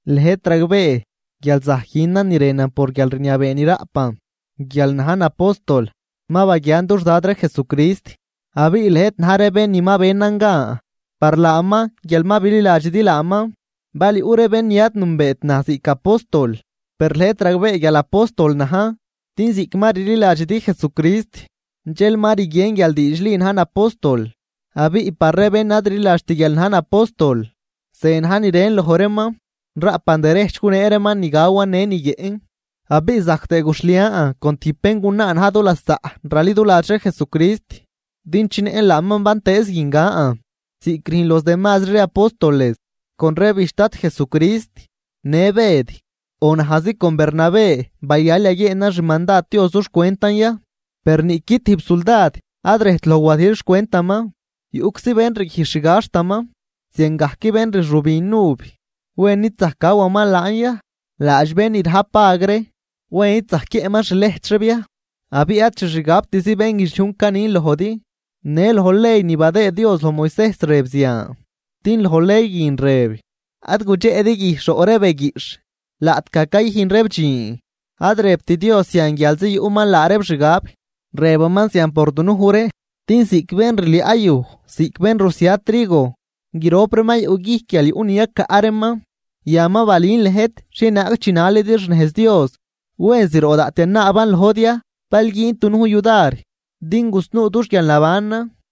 Lëjt ragbee guial zajc günan ni rënan por guialrniabee ni raꞌpan guial najn apóstol. Ma baguiaan dux Dad ree Jesucrist abiꞌ lëjt na̱j ree bén ni ma benan gan par laaman guial ma bililadxidi laaman. Bal yuꞌ ree bén ni ad nünbeet naj ziꞌc apóstol, per lëjt ragbee guial apóstol najn. Din ziꞌc ma rliladxidi Jesucrist dxel ma rguien guial diidxli najn apóstol. Abiꞌ par ree bén ad rliladxt guial najn apóstol, ze na̱j ni rën loj reeman: Raꞌpan derejch gunee reeman ni gawan në ni guiëꞌn. Abiꞌ zajc tëë guxhlian con tijb béngunaa na̱j dulasaꞌ raliduladx ree Jesucrist din chinëꞌn laaman bantëëz guin gan, ziꞌc rüjn los demazri ree apóstoles con ree bijch Dad Jesucrist në Bëd. ¿O najzi con Bernabé bayal yaguieenan xmandad Dios dux cwentan ya? Per niꞌqui tijb suldad ad rejt loj wadijl xcwentaman, yuꞌczi bén rguijx xgaxtaman. Ziangajc bén rxübin uv, ¿wen id zajc gawaman laan ya? Laadx bén ni rajp vag ree, ¿wen id zajc guiëꞌman xlejch reeb ya? Abiꞌ ad xixgabtzi bénguidxliujn canin lojdi, në loj ley ni badëë Dios loj Moisejs rëb zian. Din loj ley guin rëb: “Ad gudxeꞌdi guijxh roꞌ ree be guiꞌxh laꞌtgaj cayüjn reeb dxiin.” Ad rëbt Dios zian guialzi yuꞌman laa reeb xgab, rëbaman zian por dunuj ree. Din ziꞌc bén rliaꞌ yuj ziꞌc bén rusia trigo, grop reeman yuꞌguijc guial yuꞌ ni yacaꞌ reeman. Yan ma balün lëjt xhienaag chinalidi xnejz Dios, ¿wen zroꞌ daꞌt yanaaban lojdi ya bal güündi dunujn yudar din gusnuu dux guialnabanan?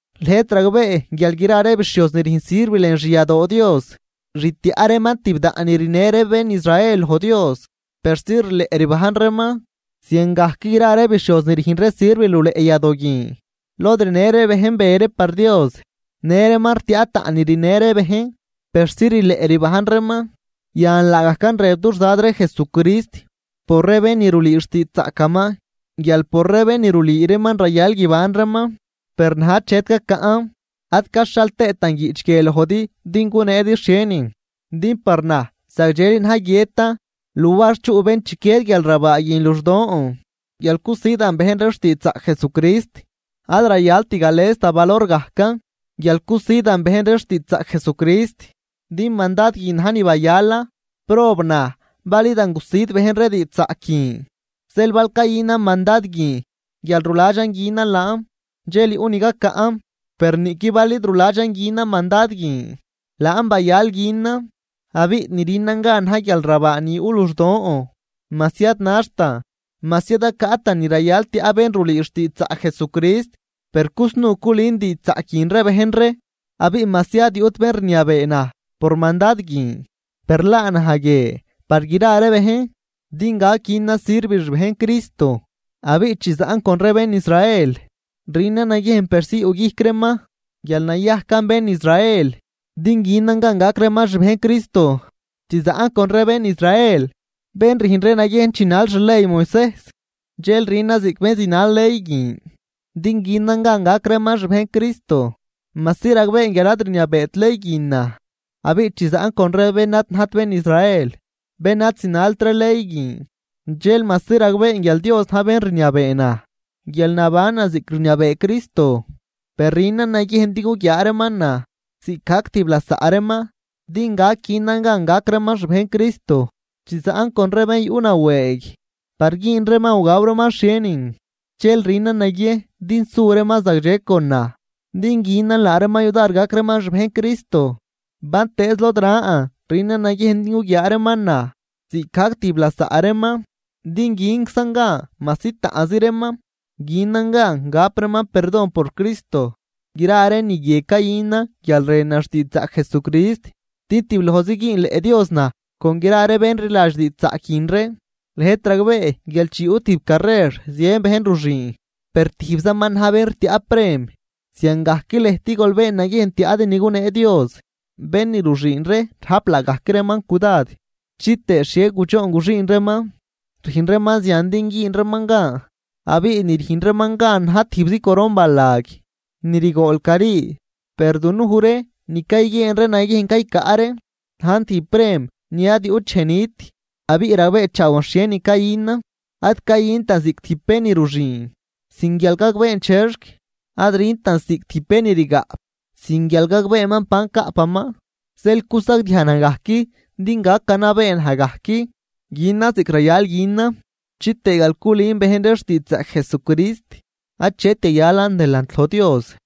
Lëjt ragbee guial gra ree bixhioz ni rüjn sirv lën xyadoo Dios, rtiaꞌ reeman tibdaꞌn ni rinë ree bén Israel loj Dios persi rileꞌ rbajn reeman. Ziangajc gra ree bixhioz ni rüjn ree sirv luleꞌ yadoo guin lod rinë ree bejn be ree par Dios, në reeman rtiaꞌ taꞌn ni rinë ree bejn persi rileꞌ rbajn reeman. Yan laagajcan rëb dux Dad ree Jesucrist por ree bén ni rulüü xtiidxzaꞌcaman, guial por ree bén ni rulüü reeman rayal guiban reeman. Per naj achet cacaꞌn, ad caxhal tëëtan guiꞌch guie lojdi din guneedi xhienin. Din par naj zagdxeli na̱j guiëtan luar chuꞌ bén chiquied guialrabaa guin luxdon guial cusidan bejn ree xtiidxzaꞌc Jesucrist. Ad rayalt gales da valor gajcan guial cusidan bejn ree xtiidxzaꞌc Jesucrist, din mandad guin na̱j ni bayalan. ¡Prob naj bal idan gusid bejn ree diidxzaꞌc guin! Zeel bal cayünan mandad guin guial ruladxan günan laan, dxel yuꞌ ni gacaꞌn. Per niꞌqui bal id ruladxan günan mandad guin, laan bayal günan. Abiꞌ ni rünan gan na̱j guialrabaa ni yuꞌ luxdon majsi ad naxtan, majsi ad cacaꞌtan ni rayal tiaꞌ bén ni rulüü xtiidxzaꞌc Jesucrist, per cusnuu culün diidxzaꞌc guin ree bejn ree. Abiꞌ majsi ad yuꞌt bén rniabee naj por mandad guin, per laa naj guie par gra ree bejn din gac günan sirv xbejn Cristo. Abiꞌ chi zaꞌn con ree bén Israel, rünan naguiejn persi yuꞌguijc reeman guial nayajcan bén Israel din günan gan gac reeman xbejn Cristo. Chi zaꞌn con ree bén Israel bén rüjn ree naguiejn chinal xley Moisejs dxel rünan ziꞌc bén zinal ley guin, din günan gan gac reeman xbejn Cristo, majsi ragbeen guial ad rniabeet ley guin naj. Abiꞌ chi zaꞌn con ree bén ad najt bén Israel, bén ad zinalt ree ley guin dxel majsi ragbeen guial Dios na̱j bén rniabee naj guial nabanan ziꞌc rniabee Cristo, per rünan naguiejn din guguiaa reeman naj ziꞌcgajc tijb lasaꞌ reeman din gac günan gan gac reeman xbejn Cristo. Chi zaꞌn con ree bén yuꞌnawëëg par güün reeman o gaw reeman xhienin, dxel rünan naguiejn din su reeman zagdxe con naj din günan laa reeman yudar gac reeman xbejn Cristo. Bantëëz lod ran rünan naguiejn din guguiaa reeman naj ziꞌcgajc tijb lasaꞌ reeman, din günczan gan majsi taꞌnzi reeman günan gan gap reeman perdon por Cristo. Gra ree ni guie cayünan guial rënan xtiidxzaꞌc Jesucrist, din tiblojzi güünleꞌ Dios naj con gra ree bén rliladx diidxzaꞌc guin ree. Lëjt ragbee guial chi yuꞌ tijb carrer zien bejn ruxüün, per tijbzaman na̱j bén rtiaꞌ prem. Ziangajc lëjt gol been naguiejn tiaꞌdi ni gunee Dios. Bén ni ruxüün ree rajp laagajc reeman cudad chitëë xhie gudxoon guxüün reeman. Rüjn reeman zian din güün reeman gan, abiꞌ ni rüjn reeman gan na̱j tijbzi coron balag ni rigool cari. Per dunuj ree ni cayguieen ree naguiejn caycaꞌ ree najn tijb prem ni ad yuꞌt dxej nit. Abiꞌ ragbeechaawan xhienin cayünan, ad cayüntan ziꞌc tijb bén ni ruxüün sin guial gagbeen chexc, ad rüntan ziꞌc tijb bén ni rgaꞌp sin guial gagbeeman ban caꞌpaman. Zeel cusagdiaj naj gajc din gac ganabee naj gajc günan ziꞌc rayal günan, chitëë guial culün bejn ree xtiidxzaꞌc Jesucrist achet yayalan delant loj Dios.